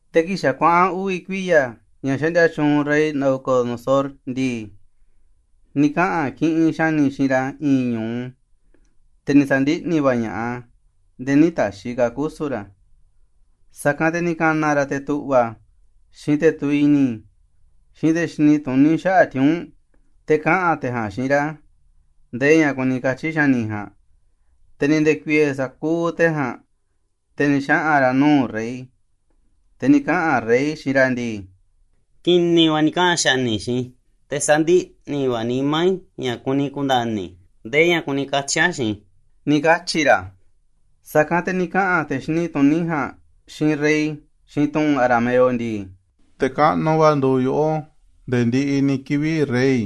Te̱ kii̱ꞌ xa̱ kuaꞌa̱n uvi̱ kuiya̱ ña̱ xaꞌndia tyuunꞌ rey Nabucodonosor ndii, ni̱ kaꞌa̱n kiꞌinꞌ xa̱ni̱ xiinꞌ ra̱ i̱i̱n ñu̱u, te̱ ni̱ sa̱ndiꞌni̱ va̱ ña̱ꞌaꞌ a̱ nde̱e̱ nï̱ ta̱xi̱ ka̱ a̱ kusu̱n ra̱. Sa̱kanꞌ te̱ ni̱ ka̱na̱ ra̱ te̱ tu̱ꞌva̱, xiinꞌ te̱ tuviꞌ i̱ni̱, xiinꞌ te̱ xini tuní xaꞌa̱ꞌ tiuu̱nꞌ, te̱ kaꞌa̱n te̱ ja̱a̱nꞌ xiinꞌ ra̱ ndee ña̱ kuni katyi̱ xa̱ni̱ ja̱a̱nꞌ. Te̱ ni̱ nde̱ku̱i̱e̱ sa̱kuuꞌ te̱ ja̱a̱nꞌ, te̱ ni̱ xaꞌa̱n ra̱ nuu̱ꞌ rey, te̱ ni̱ kaꞌa̱n rey xiinꞌ ra̱ ndii: ―Ki̱ni̱ va̱ ni̱ kaꞌa̱n xa̱ni̱ xiinꞌ i̱, te̱ sandiꞌni̱ va̱ a̱ nimá i̱ ña̱ kuni ku̱nda̱ni̱ i̱ ndee ña̱ kuni katyi̱ a̱ xiinꞌ i̱ ―ni̱ katyi̱ ra̱. Sa̱kanꞌ te̱ ni̱ kaꞌa̱n te̱ xini tuní ja̱a̱nꞌ xiinꞌ rey xiinꞌ tu̱ꞌu̱n arameo ndii: ―Te̱ kaꞌnuꞌ va̱ nduuꞌ yoꞌó nde̱e̱ ndiꞌiꞌ ni̱ kivi̱ꞌ, rey.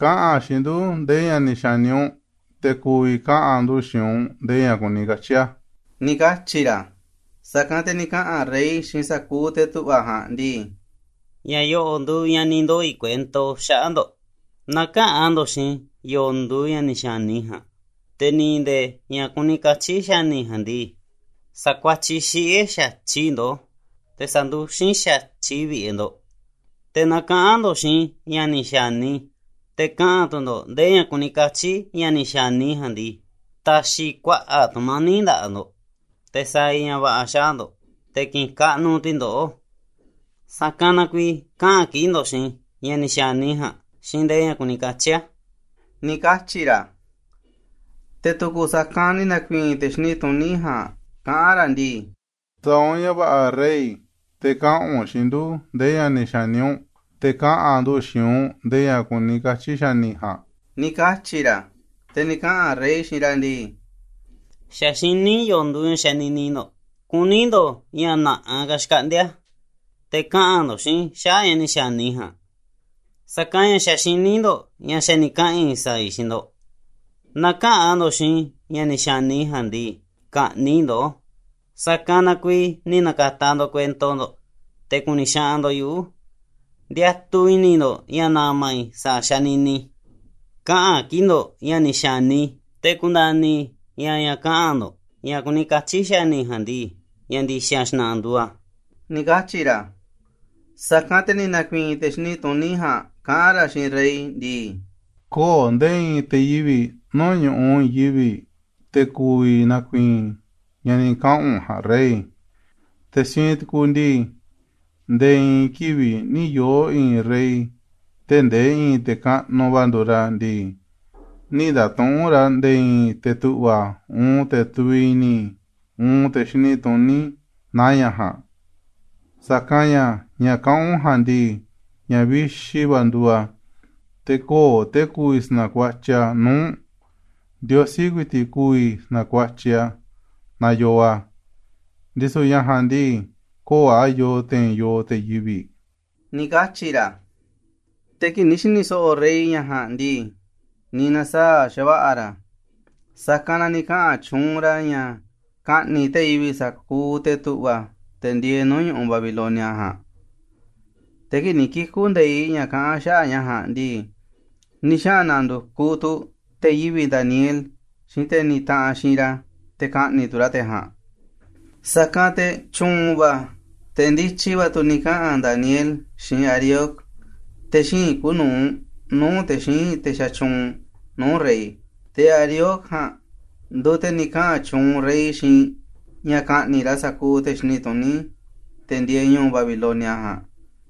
Kaꞌa̱n xiinꞌ ndu̱ ndee ña̱ ni̱ xa̱ni u̱nꞌ, te̱ ku̱vi̱ kaꞌa̱n ndu̱ xiinꞌ u̱nꞌ ndee ña̱ kuni katyi̱ a̱ ―ni̱ katyi̱ ra̱. Sa̱kanꞌ te̱ ni̱ kaꞌa̱n rey xiinꞌ sa̱kuuꞌ te̱ tu̱ꞌva̱ ja̱a̱nꞌ ndii: ―Ña̱ yo̱ꞌo̱ꞌ nduuꞌ ña̱ ni̱ ndoo̱ i̱ kuento xaꞌa̱ꞌ ndo̱ꞌ. Naaꞌ käꞌa̱n ndo̱ꞌ xiinꞌ i̱ yo̱o̱ nduuꞌ ña̱ ni̱ xa̱ni i̱ ja̱a̱nꞌ, te̱ ni̱ ndee ña̱ kuni katyi̱ xa̱ni̱ ja̱a̱nꞌ ndii, sa̱kuatyiꞌ xiꞌe̱ xa̱tyiꞌ i̱ ndoꞌó, te̱ sa̱nduxín xa̱tyiꞌ vi̱ꞌe̱ ndo̱ꞌ. Te̱ naaꞌ kaꞌa̱n ndo̱ꞌ xiinꞌ i̱ ña̱ ni̱ xa̱ni i̱, te̱ kaꞌa̱n tu̱ ndo̱ꞌ ndee ña̱ kuni katyi̱ ña̱ ni̱ xa̱ni i̱ ja̱a̱nꞌ ndii, ta̱xi̱ i̱ kuaꞌa̱ꞌ tu̱mani̱ꞌ nda̱ꞌaꞌ ndo̱ꞌ, te̱ sa̱a̱ i̱ ña̱ va̱ꞌa̱ xaꞌa̱ꞌ ndo̱ꞌ, te̱ ki̱ꞌi̱n kaꞌnuꞌ tu̱ i̱ ndoꞌó. Sa̱kanꞌ na kuiiꞌ kaꞌa̱n kiꞌi̱ꞌ ndo̱ꞌ xiinꞌ i̱ ña̱ ni̱ xa̱ni i̱ ja̱a̱nꞌ xiinꞌ ndee ña̱ kuni katyi̱ a̱ ―ni̱ katyi̱ ra̱. Te̱ tu̱ku̱ sa̱kanꞌ ni̱ na̱ku̱i̱i̱n te̱ xini tuní ja̱a̱nꞌ kaꞌán ra̱ ndii: ―Sa̱a̱ u̱nꞌ ña̱ va̱ꞌa̱ rey, te̱ kaꞌa̱n u̱nꞌ xiinꞌ ndu̱ ndee ña̱ ni̱ xa̱ni u̱nꞌ, te̱ kaꞌa̱n ndu̱ xiinꞌ u̱nꞌ ndee ña̱ kuni katyi̱ xa̱ni̱ ja̱a̱nꞌ ―ni̱ katyi̱ ra̱. Te̱ ni̱ kaꞌa̱n rey xiinꞌ ra̱ ndii: ―Xa̱ xiní i̱ yo̱o̱ nduuꞌ ña̱ xanini ndo̱ꞌ, kuní ndo̱ꞌ ña̱ na̱ꞌaꞌ ka̱ xkaꞌndi̱a̱ te̱ kaꞌa̱n ndo̱ꞌ xiinꞌ i̱ xaꞌa̱ꞌ ña̱ ni̱ xa̱ni i̱ ja̱a̱nꞌ, sa̱kanꞌ ña̱ xa̱ xiní ndo̱ꞌ ña̱ xa̱ ni̱ kaꞌa̱n i̱ sa̱a̱ i̱ xiinꞌ ndo̱ꞌ. Naaꞌ käꞌa̱n ndo̱ꞌ xiinꞌ i̱ ña̱ ni̱ xa̱ni i̱ ja̱a̱nꞌ ndii, ka̱ꞌni̱ꞌ i̱ ndoꞌó. Sa̱kanꞌ na kuiiꞌ ni̱ na̱ka̱ta̱ ndo̱ꞌ kuento ndo̱ꞌ, te̱ ku̱ni̱ xaꞌanꞌ ndo̱ꞌ yuꞌu̱. Ndiatuꞌ i̱ni̱ ndo̱ꞌ ña̱ na̱ma̱ i̱ sa̱a̱ xanini i̱. Kaꞌa̱n kii̱ꞌ ndo̱ꞌ ña̱ ni̱ xa̱ni i̱ te̱ ku̱nda̱ni̱ i̱ ña̱ ña̱ kaꞌa̱n ndo̱ꞌ ña̱ kuni katyi̱ xa̱ni̱ ja̱a̱nꞌ ndii, ña̱ ndi̱xa̱ xna̱ꞌa̱ nduuꞌ a̱ ―ni̱ katyi̱ ra̱. Sa̱kanꞌ te̱ ni̱ na̱ku̱i̱i̱n te̱ xini tuní ja̱a̱nꞌ kaꞌán ra̱ xiinꞌ rey ndii: ―Kö̱o̱ nde̱e̱ i̱i̱n te̱ yivi̱ꞌ nuu̱ꞌ ñu̱ꞌuꞌ i̱i̱n yivi̱ꞌ te̱ ku̱vi̱ na̱ku̱i̱i̱n ña̱ ni̱ kaꞌa̱n u̱nꞌ ja̱a̱nꞌ, rey. Te̱ siinꞌ tukuuꞌ ndii, nde̱e̱ i̱i̱n kivi̱ꞌ nï̱ yoo̱ i̱i̱n rey, tee̱ꞌ ndee i̱i̱n te̱ kaꞌnuꞌ va̱ nduuꞌ ra̱ ndii, nï̱ nda̱tuꞌu̱nꞌ ra̱ nde̱e̱ i̱i̱n te̱ tu̱ꞌva̱, uun te̱ tuviꞌ i̱ni̱, uun te̱ xini tuní naaꞌ ña̱ ja̱a̱nꞌ. Sa̱kanꞌ ña̱, ña̱ kaꞌán u̱nꞌ ja̱a̱nꞌ ndii, ña̱ vixi va̱ nduuꞌ a̱, te̱ kö̱o̱ te̱ ku̱vi̱ sa̱na̱kuatyiꞌ a̱ nuu̱ꞌ u̱nꞌ. Ndiosí ku̱i̱ti̱ꞌ ku̱vi̱ sa̱na̱kuatyiꞌ a̱ naaꞌ yoo a̱, ndisu̱ ña̱ ja̱a̱nꞌ ndii, kö̱o̱ a̱ yoo te̱i̱n yooꞌ te̱ yivi̱ꞌ ―ni̱ katyi̱ ra̱. Te̱ kii̱ꞌ ni̱ xi̱ni̱ so̱ꞌo̱ rey ña̱ ja̱a̱nꞌ ndii, ni̱ na̱saa̱ꞌ xa̱va̱ꞌa̱ ra̱, sa̱kanꞌ na ni̱ kaꞌa̱n tyuunꞌ ra̱ ña̱ ka̱ꞌni̱ꞌ te̱ yivi̱ꞌ sa̱kuuꞌ te̱ tu̱ꞌva̱, te̱ ndieeꞌ nuu̱ꞌ ñu̱ꞌuꞌ Babilonia ja̱a̱nꞌ. Te̱ kii̱ꞌ ni̱ kiku̱ nde̱iꞌ ña̱ kaꞌán xaꞌa̱ꞌ ña̱ ja̱a̱nꞌ ndii, ni̱ xaꞌa̱n na̱ndu̱kuꞌ tu̱ te̱ yivi̱ꞌ Daniel xiinꞌ te̱ ni taꞌanꞌ xiinꞌ ra̱, te̱ ka̱ꞌni̱ꞌ tu̱ ra̱ te̱ ja̱a̱nꞌ. Sa̱kanꞌ te̱ tyu̱u̱n va̱, te̱ ndityi va̱ tu̱ ni̱ kaꞌa̱n Daniel xiinꞌ Arioc, te̱ xíinꞌ kuuꞌ nu̱uꞌ nuu̱ꞌ te̱ xíinꞌ te̱ xatyuunꞌ nuu̱ꞌ rey. Te̱ Arioc ja̱a̱nꞌ nduuꞌ te̱ ni̱ kaꞌa̱n tyuunꞌ rey xiinꞌ ña̱ ka̱ꞌni̱ꞌ ra̱ sa̱kuuꞌ te̱ xini tuní, te̱ ndieeꞌ ñu̱u̱ Babilonia ja̱a̱nꞌ.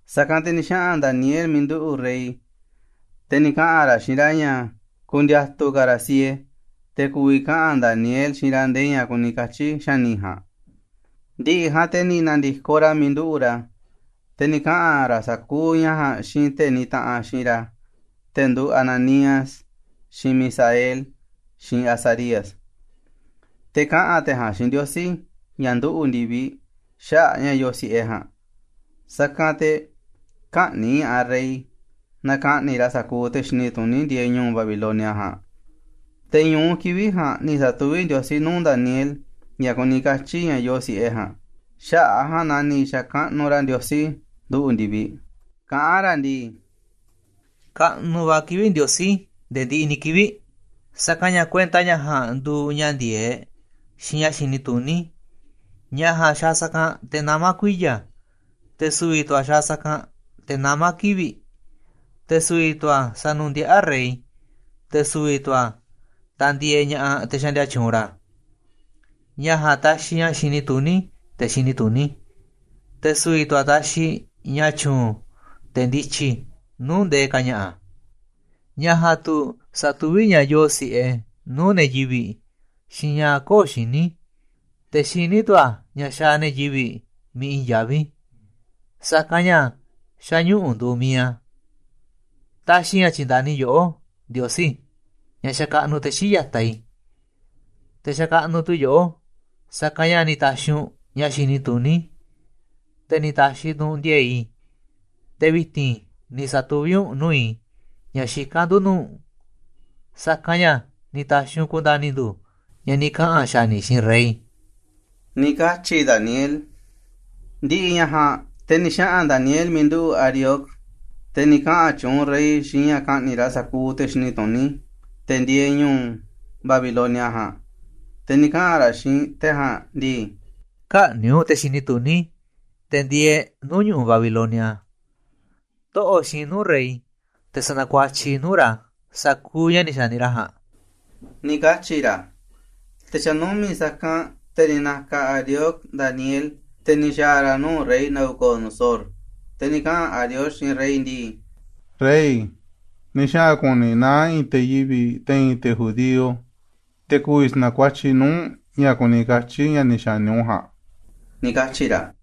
Sa̱kanꞌ te̱ ni̱ xaꞌa̱n Daniel miiꞌ nduꞌu̱ꞌ rey, te̱ ni̱ kaꞌa̱n ra̱ xiinꞌ ra̱ ña̱ ku̱ndi̱a̱tu̱ ka̱ ra̱ siee, te̱ ku̱vi̱ kaꞌa̱n Daniel xiinꞌ ra̱ ndee ña̱ kuni katyi̱ xa̱ni̱ ja̱a̱nꞌ. Ndi̱ꞌi̱ ja̱a̱nꞌ te̱ ni̱ na̱ndi̱koꞌ ra̱ miiꞌ nduꞌu̱ꞌ ra̱, te̱ ni̱ kaꞌa̱n ra̱ sa̱kuuꞌ ña̱ ja̱a̱nꞌ xiinꞌ te̱ nitaꞌanꞌ xiinꞌ ra̱, te̱ nduuꞌ Ananías, xiinꞌ Misael, xiinꞌ Azarías, te̱ kaꞌa̱n te̱ ja̱a̱nꞌ xiinꞌ Ndiosí, ña̱ nduꞌu̱ꞌ ndi̱viꞌ, xaꞌa̱ꞌ ña̱ yoo si̱ꞌe ja̱a̱nꞌ, sa̱kanꞌ te̱ kä̱ꞌni̱ꞌ ña̱ꞌaꞌ rey naaꞌ ka̱ꞌni̱ꞌ ra̱ sa̱kuuꞌ te̱ xini tuní ndieeꞌ ñu̱u̱ Babilonia ja̱a̱nꞌ. Te̱ ñu̱u kivi̱ꞌ ja̱a̱nꞌ ni̱ sa̱tuví Ndiosí nuu̱ꞌ Daniel ña̱ kuni katyi̱ ña̱ yoo si̱ꞌe ja̱a̱nꞌ. Xaꞌa̱ꞌ a̱ ja̱a̱nꞌ na ni̱ xa̱kaꞌnuꞌ ra̱ Ndiosí nduꞌu̱ꞌ ndi̱viꞌ, kaꞌán ra̱ ndii: ―Kaꞌnuꞌ va̱ kivi̱ꞌ Ndiosí nde̱e̱ ndiꞌiꞌ ni̱ kivi̱ꞌ, sa̱kanꞌ ña̱ kuenta ña̱ ja̱a̱nꞌ nduuꞌ ña̱ ndi̱e̱eꞌ xiinꞌ ña̱ xini tuní. Ña̱ ja̱a̱nꞌ xaaꞌ sa̱kanꞌ te̱ namá kuiya̱, te̱ su̱vi̱ tu̱ a̱ xaaꞌ sa̱kanꞌ te̱ namá kivi̱ꞌ, te̱ su̱vi̱ tu̱ a̱ sanundiaꞌá rey, te̱ su̱vi̱ tu̱ a̱ tandieeꞌ ña̱ꞌaꞌ te̱ xaꞌndia tyuunꞌ ra̱. Ña̱ ja̱a̱nꞌ taxiꞌ ña̱ xini tuní te̱ xini tuní, te̱ su̱vi̱ tu̱ a̱ taxiꞌ ña̱ tyu̱u̱n te̱ ndityi nuu̱ꞌ ndee ka̱ ña̱ꞌa̱. Ña̱ ja̱a̱nꞌ tu̱ satuví ña̱ yoo si̱ꞌe nuu̱ꞌ ne̱ yivi̱ꞌ, xiinꞌ ña̱ kö̱o̱ xiní, te̱ xiní tu̱ a̱ ña̱ xaaꞌ ne̱ yivi̱ꞌ miiꞌ i̱i̱n yaví, sa̱kanꞌ ña̱ xa̱ ñuꞌu̱ nduuꞌ mi̱iꞌ a̱. Taxiꞌ i̱ ña̱ tyi̱nda̱ni yoꞌó, Ndiosí, ña̱ xakaꞌnuꞌ te̱ xii̱ꞌ ya̱taꞌ i̱, te̱ xakaꞌnuꞌ tu̱ i̱ yoꞌó, sa̱kanꞌ ña̱ ni̱ ta̱xi̱ u̱nꞌ ña̱ xini tuní i̱, te̱ ni̱ ta̱xi̱ tu̱ u̱nꞌ ndi̱e̱e̱ꞌ i̱, te̱ vi̱ti̱n ni̱ sa̱tuví u̱nꞌ nuu̱ꞌ i̱ ña̱ xikán ndu̱ nuu̱ꞌ u̱nꞌ, sa̱kanꞌ ña̱ ni̱ ta̱xi̱ u̱nꞌ ku̱nda̱ni̱ ndu̱ ña̱ ni̱ kaꞌa̱n xa̱ni̱ xiinꞌ rey ―ni̱ katyi̱ Daniel. Ndi̱ꞌi̱ ña̱ ja̱a̱nꞌ, te̱ ni̱ xaꞌa̱n Daniel miiꞌ nduꞌu̱ꞌ Arioc, te̱ ni̱ kaꞌa̱n tyuunꞌ rey xiinꞌ ña̱ ka̱ꞌni̱ꞌ ra̱ sa̱kuuꞌ te̱ xini tuní, te̱ ndieeꞌ ñu̱u̱ Babilonia ja̱a̱nꞌ, te̱ ni̱ kaꞌa̱n ra̱ xiinꞌ te̱ ja̱a̱nꞌ ndii: ―Kä̱ꞌni̱ꞌ u̱nꞌ te̱ xini tuní, te̱ ndieeꞌ nuu̱ꞌ ñu̱ꞌuꞌ Babilonia, toꞌo̱ꞌ xiinꞌ i̱ nuu̱ꞌ rey te̱ sa̱na̱kuatyiꞌ i̱ nuu̱ꞌ ra̱ sa̱kuuꞌ ña̱ ni̱ xa̱ni ra̱ ja̱a̱nꞌ ―ni̱ katyi̱ ra̱. Te̱ xa̱ numi̱ꞌ sa̱kanꞌ, te̱ ni̱ na̱ka̱ Arioc Daniel, te̱ ni̱ xa̱a̱ ra̱ nuu̱ꞌ rey Nabucodonosor, te̱ ni̱ kaꞌa̱n Arioc xiinꞌ rey ndii: ―Rey, ni̱ xaꞌa̱n ku̱ni̱ i̱ naá i̱i̱n te̱ yivi̱ꞌ te̱i̱n te̱ judío, te̱ ku̱vi̱ sa̱na̱kuatyiꞌ nuu̱ꞌ u̱nꞌ ña̱ kuni katyi̱ ña̱ ni̱ xa̱ni u̱nꞌ ja̱a̱nꞌ ―ni̱ katyi̱ ra̱.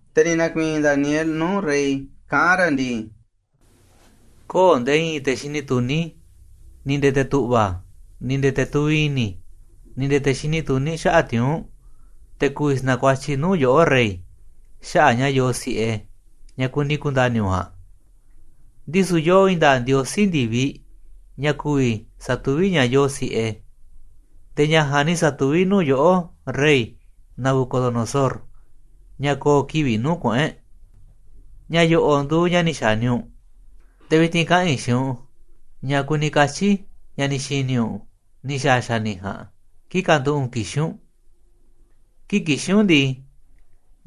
Te̱ ni̱ na̱ku̱i̱i̱n Daniel nuu̱ꞌ rey kaꞌán ra̱ ndii: ―Kö̱o̱ nde̱e̱ i̱i̱n te̱ xini tuní, ni̱ nde̱e̱ te̱ tu̱ꞌva̱, ni̱ nde̱e̱ te̱ tuviꞌ i̱ni̱, ni̱ nde̱e̱ te̱ xini tuní xaꞌa̱ꞌ tiuu̱nꞌ, te̱ ku̱vi̱ sa̱na̱kuatyiꞌ nuu̱ꞌ yoꞌó, rey, xaꞌa̱ꞌ ña̱ yoo si̱ꞌe ña̱ kuni ku̱nda̱ni̱ u̱nꞌ ja̱a̱nꞌ. Ndisu̱ yoo i̱i̱n nda̱a̱ꞌ Ndiosí ndi̱viꞌ ña̱ ku̱vi̱ satuví ña̱ yoo si̱ꞌe, te̱ ña̱ ja̱a̱nꞌ ni̱ sa̱tuví nuu̱ꞌ yoꞌó, rey Nabucodonosor, ña̱ ko̱o̱ kivi̱ꞌ nuu̱ꞌ kuꞌu̱n e̱ꞌ. Ña̱ yo̱ꞌo̱ꞌ nduuꞌ ña̱ ni̱ xa̱ni u̱nꞌ, te̱ vi̱ti̱n kaꞌa̱n i̱ xiinꞌ u̱nꞌ ña̱ kuni katyi̱ ña̱ ni̱ xi̱ni̱ u̱nꞌ, ni̱ xa̱a̱ xa̱ni̱ ja̱a̱nꞌ kii̱ꞌ kanduꞌu̱ꞌ u̱nꞌ kixín u̱nꞌ. Kii̱ꞌ kixín u̱nꞌ ndii,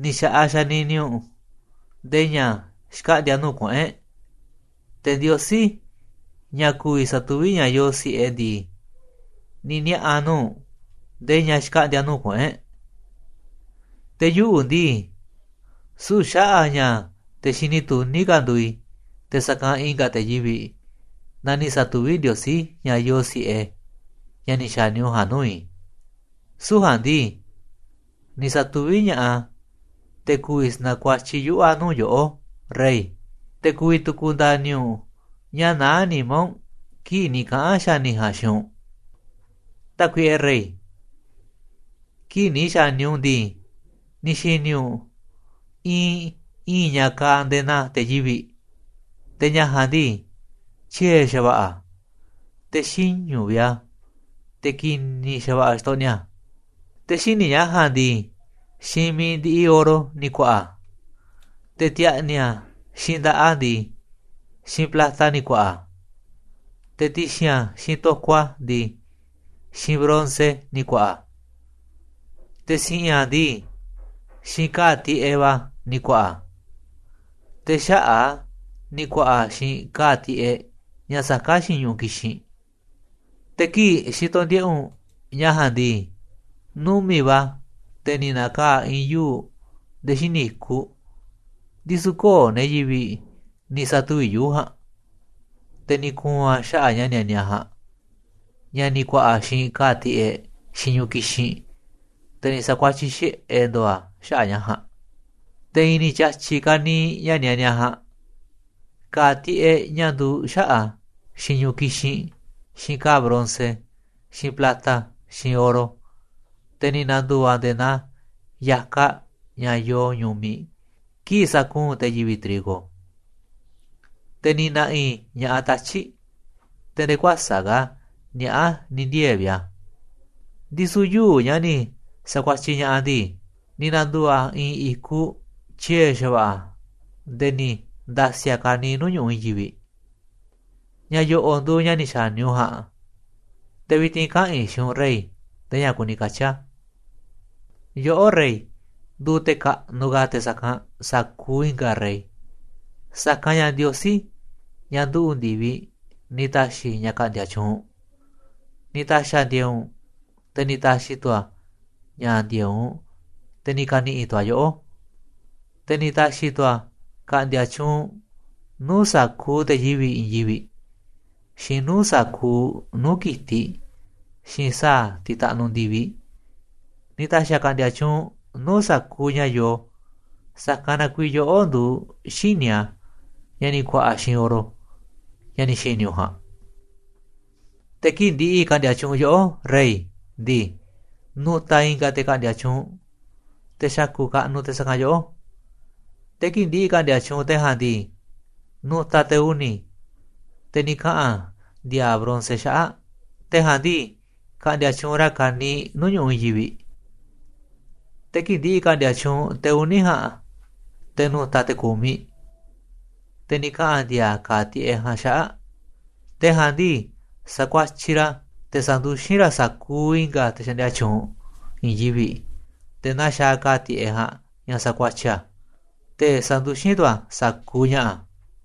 ni̱ xa̱ꞌaꞌ xanini u̱nꞌ ndee ña̱ xkaꞌndi̱a̱ nuu̱ꞌ kuꞌu̱n e̱ꞌ, te̱ Ndiosí, ña̱ ku̱vi̱ satuví ña̱ yoo si̱ꞌe ndii, ni̱ niaꞌa̱ nuu̱ꞌ u̱nꞌ ndee ña̱ xkaꞌndi̱a̱ nuu̱ꞌ kuꞌu̱n e̱ꞌ. Te̱ yuꞌu̱ ndii, süu̱ꞌ xaꞌa̱ꞌ a̱ ña̱ te̱ xini tuní ka̱ nduuꞌ i̱ te̱ sa̱kanꞌ i̱nga̱ te̱ yivi̱ꞌ na ni̱ sa̱tuví Ndiosí ña̱ yoo si̱ꞌe, ña̱ ni̱ xa̱ni u̱nꞌ ja̱a̱nꞌ nuu̱ꞌ i̱, süu̱ꞌ ja̱a̱nꞌ ndii, ni̱ sa̱tuví ña̱ꞌaꞌ a̱ te̱ ku̱vi̱ sa̱na̱kuatyiꞌ yuꞌu̱ a̱ nuu̱ꞌ yoꞌó, rey, te̱ ku̱vi̱ tu̱ ka̱nda̱ni̱ u̱nꞌ ña̱ naá nimá u̱nꞌ kii̱ꞌ ni̱ kaꞌa̱n xa̱ni̱ ja̱a̱nꞌ xiinꞌ u̱nꞌ. “Tákuiꞌe rey, kii̱ꞌ ni̱ xa̱ni u̱nꞌ ndii, ni̱ xi̱ni̱ u̱nꞌ iinꞌ i̱i̱n ña̱ kaaꞌ nde̱e̱ naa te̱ yivi̱ꞌ, te̱ ña̱ ja̱a̱nꞌ ndii, tyie̱ xa̱va̱ꞌa̱ a̱ te̱ xiñu̱ vi̱ꞌ a̱, te̱ ki̱ni̱ xa̱va̱ꞌa̱ xtoꞌniꞌ a̱. Te̱ xíniꞌ ña̱ ja̱a̱nꞌ ndii, xiinꞌ mi̱iꞌ ndiꞌiꞌ oro ni̱ ku̱a̱ꞌa̱ a̱, te̱ ti̱a̱ꞌni̱ a̱ xiinꞌ nda̱ꞌaꞌ a̱ ndii, xiinꞌ plata ni̱ ku̱a̱ꞌa̱ a̱, te̱ ti̱xi̱n a̱ xiinꞌ to̱koꞌ a̱ ndii, xiinꞌ bronce ni̱ ku̱a̱ꞌa̱ a̱, te̱ si̱ꞌi̱n a̱ ndii, xiinꞌ ka̱a̱ tiꞌeꞌ va̱ ni̱ ku̱a̱ꞌa̱ a̱, te̱ xaꞌa̱ꞌ a̱ ni̱ ku̱a̱ꞌa̱ xiinꞌ ka̱a̱ tiꞌeꞌ ña̱ saká xiinꞌ ñu̱ꞌuꞌ kixinꞌ. Te̱ kii̱ꞌ xitoꞌ ndiꞌe̱ꞌ u̱nꞌ ña̱ ja̱a̱nꞌ ndii, numi̱ꞌ va̱ te̱ ni̱ na̱kaa̱ꞌ i̱i̱n yuu̱ꞌ nde̱e̱ xíniꞌ i̱kuꞌ, ndisu̱ kö̱o̱ ne̱ yivi̱ꞌ ni̱ sa̱tuvi̱ꞌ yuu̱ꞌ ja̱a̱nꞌ, te̱ ni̱ ku̱u̱n a̱ xaꞌa̱ꞌ ña̱ nianiaꞌ ja̱a̱nꞌ, ña̱ ni̱ ku̱a̱ꞌa̱ xiinꞌ ka̱a̱ tiꞌeꞌ, xiinꞌ ñu̱ꞌuꞌ kixinꞌ, te̱ ni̱ sa̱kuatyiꞌ xiꞌe̱ ndo̱o̱ a̱ xaꞌa̱ꞌ ña̱ ja̱a̱nꞌ. Te̱ i̱i̱n ni̱ tyi̱a̱tyi̱ ka̱niiꞌ ña̱ nianiaꞌ ja̱a̱nꞌ, ka̱a̱ tiꞌeꞌ ña̱ nduuꞌ xaꞌa̱ꞌ a̱, xiinꞌ ñu̱ꞌuꞌ kixinꞌ, xiinꞌ ka̱a̱ bronce, xiinꞌ plata, xiinꞌ oro, te̱ ni̱ na̱ndu̱u̱ a̱ nde̱e̱ naa ya̱kaꞌ ña̱ yoo ñu̱miꞌ kii̱ꞌ sakuunꞌ te̱ yivi̱ꞌ trigo, te̱ ni̱ na̱ꞌi̱ ña̱ꞌaꞌ tatyi̱ꞌ te̱ nde̱e̱ kuäsa̱ꞌ ka̱ niaꞌá ni̱ ndiee̱ vi̱ꞌ a̱. Ndisu̱ yuu̱ꞌ ña̱ ni̱ sa̱kuatyiꞌ ña̱ꞌaꞌ ndii, ni̱ na̱ndu̱u̱ a̱ i̱i̱n i̱kuꞌ tyie̱ xa̱va̱ꞌa̱ nde̱e̱ ni̱ nda̱si̱ a̱ ka̱niiꞌ nuu̱ꞌ ñu̱ꞌuꞌ i̱i̱n yivi̱ꞌ. “Ña̱ yo̱ꞌo̱ꞌ nduuꞌ ña̱ ni̱ xa̱ni u̱nꞌ ja̱a̱nꞌ, te̱ vi̱ti̱n kaꞌa̱n i̱ xiinꞌ u̱nꞌ rey ndee ña̱ kuni katyi̱ a̱. Yoꞌó, rey, nduuꞌ te̱ kaꞌnuꞌ ka̱ te̱ sa̱kanꞌ sa̱kuuꞌ i̱nga̱ rey, sa̱kanꞌ ña̱ Ndiosí, ña̱ nduꞌu̱ꞌ ndi̱viꞌ, ni̱ ta̱xi̱ ña̱ ka̱ꞌndi̱a̱ tyuunꞌ u̱nꞌ, ni̱ ta̱xi̱ a̱ ndi̱e̱e̱ꞌ u̱nꞌ, te̱ ni̱ ta̱xi̱ tu̱ a̱ ña̱ ndi̱e̱eꞌ u̱nꞌ, te̱ ni̱ ka̱ni̱ꞌi̱ tu̱ a̱ yoꞌó. Te̱ ni̱ ta̱xi̱ tu̱ a̱ ka̱ꞌndi̱a̱ tyuunꞌ u̱nꞌ nuu̱ꞌ sa̱kuuꞌ te̱ yivi̱ꞌ i̱i̱n yivi̱ꞌ, xiinꞌ nuu̱ꞌ sa̱kuuꞌ nuu̱ꞌ ki̱tiꞌ, xiinꞌ sa̱a̱ tiꞌ taꞌnuꞌ ndi̱viꞌ. Ni̱ ta̱xi̱ a̱ ka̱ꞌndi̱a̱ tyuunꞌ u̱nꞌ nuu̱ꞌ sa̱kuuꞌ ña̱ yoo, sa̱kanꞌ na kuiiꞌ yoꞌó nduuꞌ xíniꞌ a̱, ña̱ ni̱ ku̱a̱ꞌa̱ xiinꞌ oro, ña̱ ni̱ xi̱ni̱ u̱nꞌ ja̱a̱nꞌ. Te̱ kii̱ꞌ ndi̱ꞌi̱ ka̱ꞌndi̱a̱ tyuunꞌ yoꞌó, rey, ndii, nu̱ta̱ i̱nga̱ te̱ ka̱ꞌndi̱a̱ tyuunꞌ, te̱ xa̱ku̱ꞌ kaꞌnuꞌ te̱ sa̱kanꞌ yoꞌó. Te̱ kii̱ꞌ ndi̱ꞌi̱ ka̱ꞌndi̱a̱ tyuunꞌ te̱ ja̱a̱nꞌ ndii, nu̱ta̱ te̱ uni̱, te̱ ni̱ kaꞌa̱n ndi̱a̱a̱ bronce xaꞌa̱ꞌ, te̱ ja̱a̱nꞌ ndii, ka̱ꞌndi̱a̱ tyuunꞌ ra̱ ka̱niiꞌ nuu̱ꞌ ñu̱ꞌuꞌ i̱i̱n yivi̱ꞌ. Te̱ kii̱ꞌ ndi̱ꞌi̱ ka̱ꞌndi̱a̱ tyuunꞌ te̱ uni̱ ja̱a̱nꞌ, te̱ nu̱ta̱ te̱ ku̱miꞌ, te̱ ni̱ kaꞌa̱n ndi̱a̱a̱ ka̱a̱ tiꞌeꞌ ja̱a̱nꞌ xaꞌa̱ꞌ. Te̱ ja̱a̱nꞌ ndii, sa̱kuatyiꞌ ra̱, te̱ sa̱nduxín ra̱ sa̱kuuꞌ i̱nga̱ te̱ xaꞌndia tyuunꞌ i̱i̱n yivi̱ꞌ nde̱e̱ naa xaaꞌ ka̱a̱ tiꞌeꞌ ja̱a̱nꞌ ña̱ sakuatyiꞌ a̱, te̱ sanduxín tu̱ a̱ sa̱kuuꞌ ña̱ꞌa̱.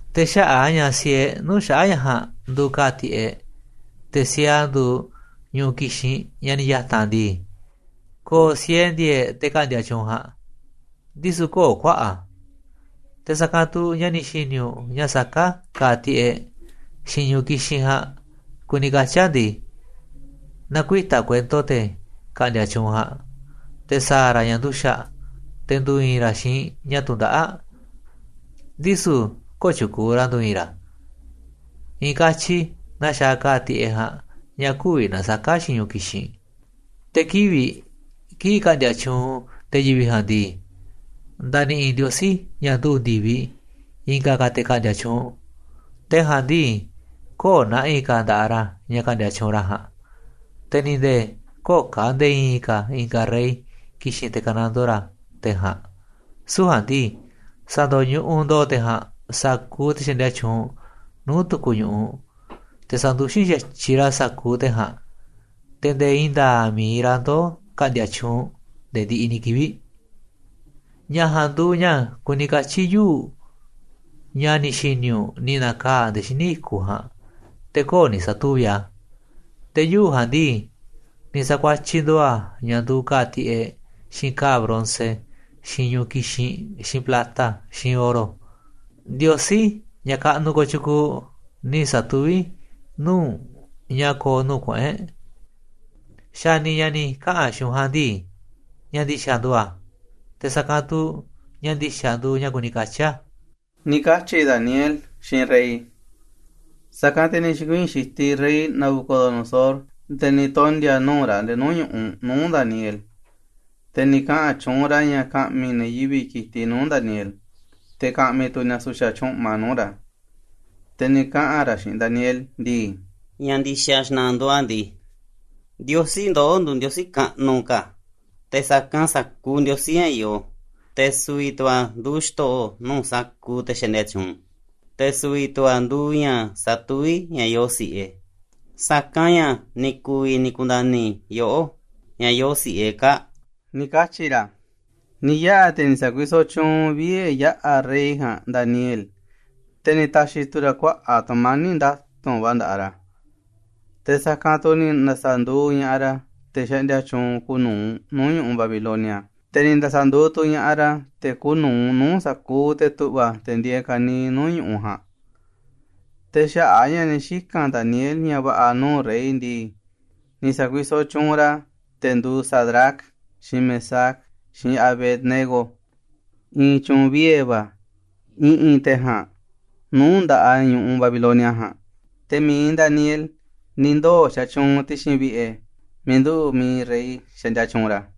Te̱ xaꞌa̱ꞌ a̱ ña̱ siee nuu̱ꞌ xaꞌa̱ꞌ ña̱ ja̱a̱nꞌ nduuꞌ ka̱a̱ tiꞌeꞌ, te̱ siee a̱ nduuꞌ ñu̱ꞌuꞌ kixinꞌ, ña̱ ni̱ ya̱ta̱n ndii, ko̱o̱ siee ndi̱e̱e̱ꞌ te̱ ka̱ꞌndi̱a̱ tyuunꞌ ja̱a̱nꞌ, ndisu̱ kö̱o̱ kuaꞌa̱ꞌ a̱. Te̱ sa̱kanꞌ tu̱ ña̱ ni̱ xi̱ni̱ u̱nꞌ ña̱ saká ka̱a̱ tiꞌeꞌ, xiinꞌ ñu̱ꞌuꞌ kixinꞌ ja̱a̱nꞌ kuni katyi̱ a̱ ndii, na̱kuita̱ kuento te̱ ka̱ꞌndi̱a̱ tyuunꞌ ja̱a̱nꞌ, te̱ sa̱a̱ ra̱ ña̱ nduxa̱ꞌ, te̱ ndu̱i̱i̱n ra̱ xiinꞌ ña̱ tundaꞌáꞌ, ndisu̱ kö̱o̱ tyu̱kuuꞌ ra̱ ndu̱i̱i̱n ra̱, i̱i̱n katyi naa xaaꞌ ka̱a̱ tiꞌeꞌ ja̱a̱nꞌ ña̱ kü̱vi̱ na̱saka̱ a̱ xiinꞌ ñu̱ꞌuꞌ kixinꞌ. Te̱ kivi̱ꞌ kii̱ꞌ ka̱ꞌndi̱a̱ tyuunꞌ te̱ yivi̱ꞌ ja̱a̱nꞌ ndii, nda̱ni̱ꞌi̱ Ndiosí, ña̱ nduꞌu̱ ndi̱viꞌ, i̱nga̱ te̱ ka̱ꞌndi̱a̱ tyuunꞌ. Te̱ ja̱a̱nꞌ ndii, kö̱o̱ na̱ꞌi̱ ka̱ nda̱ꞌaꞌ ra̱ ña̱ ka̱ꞌndi̱a̱ tyuunꞌ ra̱ ja̱a̱nꞌ, te̱ ni̱ nde̱e̱ kö̱o̱ ka̱ nde̱e̱ i̱i̱n ka̱ i̱nga̱ rey ki̱xi̱n te̱ ka̱nando ra̱ te̱ ja̱a̱nꞌ, süu̱ꞌ ja̱a̱nꞌ ndii, sa̱ndo̱ñuꞌuꞌ ndo̱o̱ te̱ ja̱a̱nꞌ sa̱kuuꞌ te̱ xaꞌndia tyuunꞌ nuu̱ꞌ tu̱ku̱ ñu̱ꞌuꞌ, te̱ sa̱nduxín xa̱tyiꞌ ra̱ sa̱kuuꞌ te̱ ja̱a̱nꞌ, te̱ ndee i̱i̱n nda̱a̱ꞌ mi̱iꞌ ra̱ ndoo̱ ka̱ꞌndi̱a̱ tyuunꞌ nde̱e̱ ndiꞌiꞌ ni̱ kivi̱ꞌ. Ña̱ ja̱a̱nꞌ nduuꞌ ña̱ kuni katyi̱ yuu̱ꞌ, ña̱ ni̱ xi̱ni̱ u̱nꞌ ni̱ na̱kaa̱ꞌ nde̱e̱ xíniꞌ i̱kuꞌ ja̱a̱nꞌ, te̱ kö̱o̱ ni̱ sa̱tuvi̱ꞌ a̱. Te̱ yuu̱ꞌ ja̱a̱nꞌ ndii, ni̱ sa̱kuatyiꞌ ndo̱o̱ a̱ ña̱ nduuꞌ ka̱a̱ꞌ tiꞌeꞌ, xiinꞌ ka̱a̱ bronce, xiinꞌ ñu̱ꞌuꞌ kixinꞌ, xiinꞌ plata, xiinꞌ oro. Ndiosí, ña̱ kaꞌnuꞌ kotyukuuꞌ, ni̱ sa̱tuví nuu̱ꞌ u̱nꞌ ña̱ ko̱o̱ nuu̱ꞌ kuꞌu̱n e̱ꞌ. Xa̱ni̱, ña̱ ni̱ kaꞌa̱n xiinꞌ u̱nꞌ ja̱a̱nꞌ ndii, ña̱ ndi̱xa̱ nduuꞌ a̱, te̱ sa̱kanꞌ tu̱ ña̱ ndi̱xa̱ nduuꞌ ña̱ kuni katyi̱ a̱ ―ni̱ katyi̱ Daniel xiinꞌ rey. Sa̱kanꞌ, te̱ ni̱ xi̱kuii̱n xitiꞌ rey Nabucodonosor nde̱e̱ ni̱ tondi̱a̱ nuu̱ꞌ ra̱ nde̱e̱ nuu̱ꞌ ñu̱ꞌuꞌ nuu̱ꞌ Daniel, te̱ ni̱ kaꞌa̱n tyuunꞌ ra̱ ña̱ ka̱ꞌmi̱ ne̱ yivi̱ꞌ ki̱tiꞌ nuu̱ꞌ Daniel, te̱ ka̱ꞌmi̱ tu̱ ni̱a̱ su̱xa̱ tyúꞌma nuu̱ꞌ ra̱. Te̱ ni̱ kaꞌa̱n ra̱ xiinꞌ Daniel ndii: ―Ña̱ ndi̱xa̱ xna̱ꞌa̱ nduuꞌ a̱ ndii, Ndiosí ndoꞌó nduuꞌ Ndiosí kaꞌnuꞌ ka̱ te̱ sa̱kanꞌ sa̱kuuꞌ ndiosí ña̱ yoo, te̱ su̱vi̱ tu̱ a̱ nduuꞌ xto̱ꞌo̱ nuu̱ꞌ sa̱kuuꞌ te̱ xaꞌndia tyuunꞌ, te̱ su̱vi̱ tu̱ a̱ nduuꞌ ña̱ satuví ña̱ yoo si̱ꞌe, sa̱kanꞌ ña̱ ni̱ ku̱vi̱ ni̱ ku̱nda̱ni̱ yoꞌó ña̱ yoo si̱ꞌe kaa̱ꞌ ―ni̱ katyi̱ ra̱. Ni̱ yaꞌa̱, te̱ ni̱ sa̱kuisoꞌ tyuunꞌ vie̱ yaꞌa̱ rey ja̱a̱nꞌ Daniel, te̱ ni̱ ta̱xi̱ tu̱ ra̱ kuaꞌa̱ꞌ tu̱mani̱ꞌ nda̱tu̱nꞌ va̱ nda̱ꞌaꞌ ra̱, te̱ sa̱kanꞌ tu̱ ni̱ nda̱sa̱nduuꞌ ña̱ꞌaꞌ ra̱ te̱ xaꞌndia tyuunꞌ kuuꞌ nu̱uꞌ nuu̱ꞌ ñu̱ꞌuꞌ Babilonia, te̱ ni̱ nda̱sa̱nduuꞌ tu̱ ña̱ꞌaꞌ ra̱ te̱ kuuꞌ nu̱uꞌ nuu̱ꞌ sa̱kuuꞌ te̱ tu̱ꞌva̱, te̱ ndieeꞌ ka̱niiꞌ nuu̱ꞌ ñu̱u̱ ja̱a̱nꞌ Te̱ xaꞌa̱ꞌ a̱ ña̱ ni̱ xika̱n Daniel ña̱ va̱ꞌa̱ nuu̱ꞌ rey ndii, ni̱ sa̱kuisoꞌ tyuunꞌ ra̱ te̱ nduuꞌ Sadrac, xiinꞌ Mesac, xiinꞌ Abed-nego i̱i̱n tyu̱u̱n vie̱ va̱ i̱ꞌi̱n te̱ ja̱a̱nꞌ nuu̱ꞌ nda̱ꞌaꞌ ñu̱ꞌuꞌ Babilonia ja̱a̱nꞌ. Te̱ mi̱iꞌ Daniel ni̱ ndoo̱ xatyuunꞌ ti̱xi̱n vi̱ꞌe̱ miiꞌ nduꞌu̱ꞌ mi̱iꞌ rey xaꞌndia tyuunꞌ ra̱.